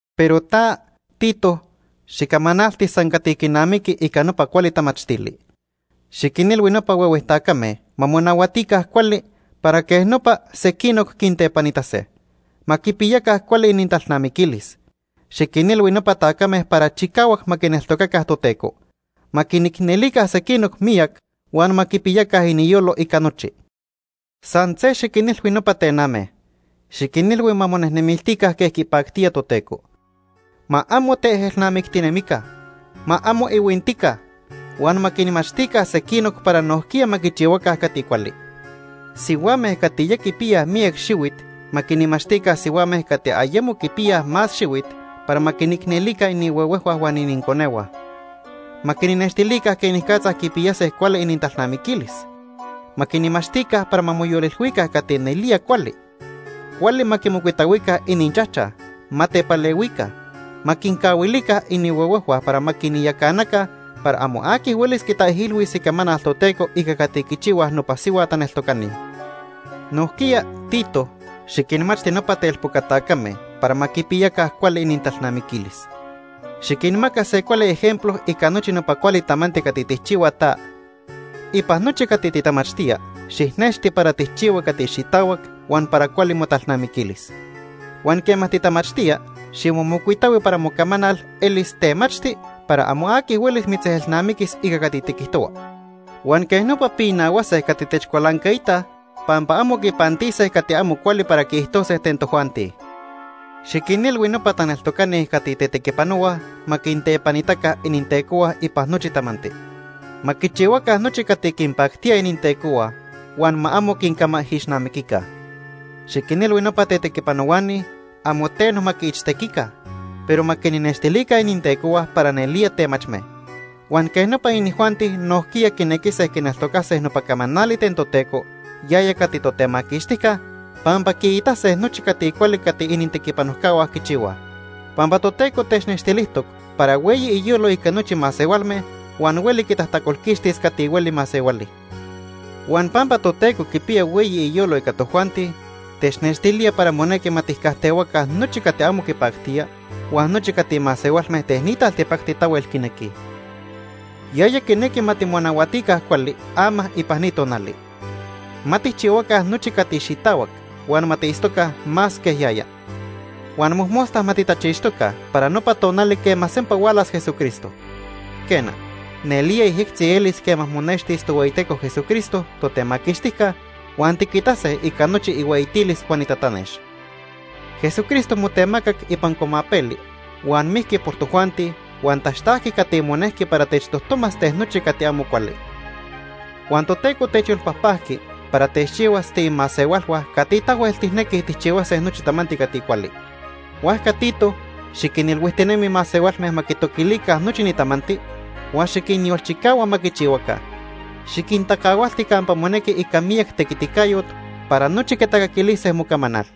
Pero ta, Tito, xicamanalti san cati quinamiqui ica nopa cuali tamachtili. Xiquinilhui nopa huehue tacame ma monahuatica cuali, para quej nopa sequinoc quintepanitase. Ma quipiyaca cuali inintalnamiquilis. Xiquinilhui nopa tacame para chicahuac ma quineltocaca Toteco. Ma quinicnelica sequinoc miyac huan ma quipiyaca iniyolo ica nochi. San se xiquinilhui nopa tename. Xiquinilhui ma monejnemiltica quej quipactía Toteco. Ma amo teejelnamictinemica. Ma amo ihuintica. Huan ma quinmachtica sequinoc para nojquiya ma quichihuaca cati cuali. Sihuame cati ya quipiyaj miyac xihuit ma quinmachtica sihuame cati ayemo quipiyaj más xihuit para ma quinicnelica inihuehuejhua huan ininconehua. Ma quinnextilica quenicatza quipiyase cuali inintalnamiquilis. Ma quinmachtica para ma moyolilhuica cati nelía cuali. Cuali ma quimocuitahuica ininchajchaj. Ma tepalehuica. Ma quincahuilise inihuehuejhua para ma quinyacanaca para amo aqui huelis quitaijilhuis icamanal Toteco ica cati quichihuaj nopa sihua taneltocani. Nojquiya, Tito, xiquinmachti nopa telpoca tacame para ma quipiya cuali inintalnamiquilis. Xiquinmaca se cuali ejemplo ica nochi nopa cuali tamanti cati tijchihua ta. Ipan nochi cati titamachtía, xijnexti para tijchihua cati xitahuac huan para cuali motalnamiquilis. Huan quema titamachtía, ximomocuitahui para mocamanal elis temachti para amo aqui huelis mitzejelnamiquis ica cati tiquijtohua. Huan quej nopa pinahuase cati techcualancaitaj pampa amo quipantise cati amo cuali para quiijtose ten tojuanti. Xiquinilhui nopa taneltocani cati tetequipanohuaj ma quintepanitaca inintecohua ipan nochi tamanti. Ma quichihuaca nochi cati quinpactía inintecohua huan ma amo quincamaijixnamiquica. Xiquinilhui nopa tetequipanohuani amo teno ma quiichtequica, pero ma quinnextilica inintecohua para nelía temachme. Huan quej nopa inijuanti nojquiya quinequise quineltocase nopa camanali ten Toteco, yaya cati Totemaquixtijca, pampa quiitase nochi cati cuali cati inintequipanojcahua quichihuaj. Pampa Toteco technextilijtoc para hueyi iyolo ica nochi masehualme huan hueli quitajtacolquixtis cati hueli masehuali. Huan pampa Toteco quipiya hueyi iyolo ica tojuanti, technextilía para monequi ma tijcajtehuaca nochi cati amo quipactía huan nochi cati masehualme ten ni taltipacti tahuel quinequij. Yaya quinequi ma timonahuatica cuali ama ipan ni tonali. Ma tijchihuaca nochi cati xitahuac, huan ma tiitztoca más quej yaya. Huan mojmosta ma titachixtoca para nopa tonali quema sempa hualas Jesucristo. Quena, nelía yejyectzi elis quema monextis Tohueyiteco Jesucristo, Totemaquixtijca, huan tiquitase ica nochi ihueyitilis huan itatanex. Jesucristo motemacac ipan cuamapeli huan mijqui por tojuanti huan taxtajqui cati monejqui para techtojtomas ten nochi cati amo cuali. Huan Toteco techyolpajpajqui para techchihuas tiimasehualhua cati tahuel tijnequij tijchihuase nochi tamanti cati cuali. Huajca Tito, xiquinilhuijtinemi masehualme ma quitoquilica nochi ni tamanti, huan xiquinyolchicahua ma quichihuaca. Xiquintacahualti campa monequi ica miyac tequiticayot para nochi quitacaquilise mocamanal.